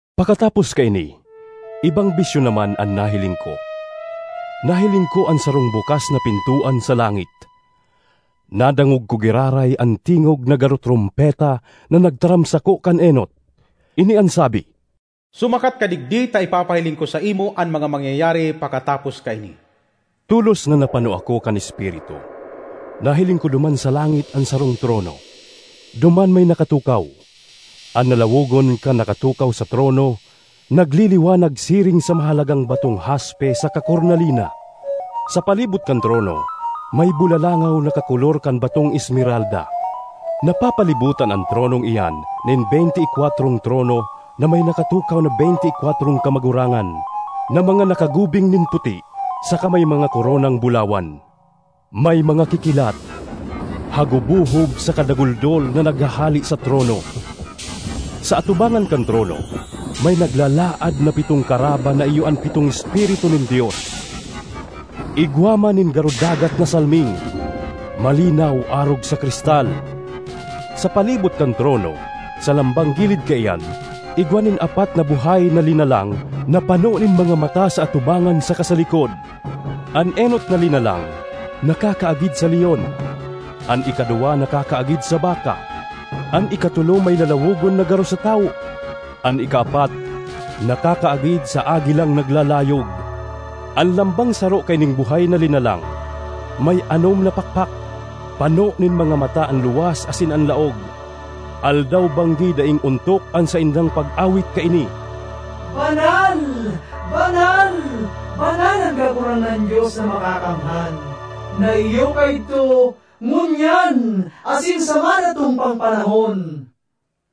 Pakatapos kaini, ibang bisyon naman an nahiling ko. Nahiling ko an sarong bukas na pintoan sa langit. Nadangog ko giraray an tingog na garo trompeta na nagtaram sako kan enot. Ini an sabi, “Sumakat ka digdi ta ipapahiling ko saimo an mga mangyayari pakatapos kaini.” Tolos na napano ako kan Espiritu. Nahiling ko duman sa langit an sarong trono; duman may nakatukaw. An lalawogon kan nakatukaw sa trono nagliliwanag siring sa mahalagang batong haspe saka kornalina; sa palibot kan trono may bulalangaw na kakolor kan batong esmeralda. Napapalibotan an tronong iyan nin beynte y kwatrong trono na may nakatukaw na beynte y kwatrong kamagurangan, na mga nakagubing nin puti saka may mga koronang bulawan. May mga kikilat, hagubohob saka daguldol na naghahale sa trono. Sa atubangan kan trono may naglalaad na pitong karaba na iyo an pitong Espiritu nin Dios. Igwa man nin garo dagat na salming, malinaw arog sa kristal. Sa palibot kan trono, sa lambang gilid kaiyan, igwa nin apat na buhay na linalang na pano nin mga mata sa atubangan saka sa likod. An enot na linalang nakakaagid sa leon; an ikaduwa nakakaagid sa baka; an ikatolo may lalawogon na garo sa tawo; an ikaapat nakakaagid sa agilang naglalayog. An lambang saro kaining buhay na linalang may anom na pakpak, pano nin mga mata an luwas asin an laog. Aldaw-banggi daing ontok an saindang pag-awit kaini: “Banal, banal, banal an Kagurangnan Dios na Makakamhan, na iyo kaidto, ngunyan, asin sa madatong pang panahon.”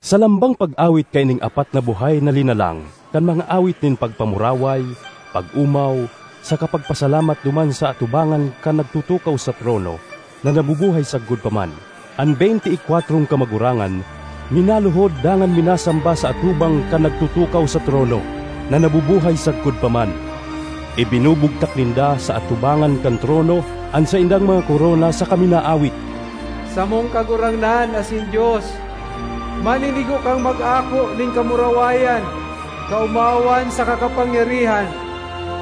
Sa lambang pag-awit kaining apat na buhay na linalang kan mga awit nin pagpamuraway, pag-omaw, saka pagpasalamat duman sa atubangan kan nagtutukaw sa trono na nabubuhay sagkod pa man, an beynte y kwatrong kamagurangan minaluhod dangan minasamba sa atubang kan nagtutukaw sa trono, na nabubuhay sagkod pa man. Ibinubugtak ninda sa atubangan kan trono an saindang mga korona saka minaawit: ”Samong Kagurangnan asin Dios! Maninigo kang mag-ako nin kamurawayan, kaomawan saka kapangyarihan.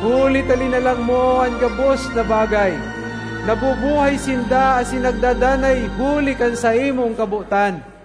Huli ta linalang mo an gabos na bagay, nabubuhay sinda asin nagdadanay huli kan saimong kabotan.”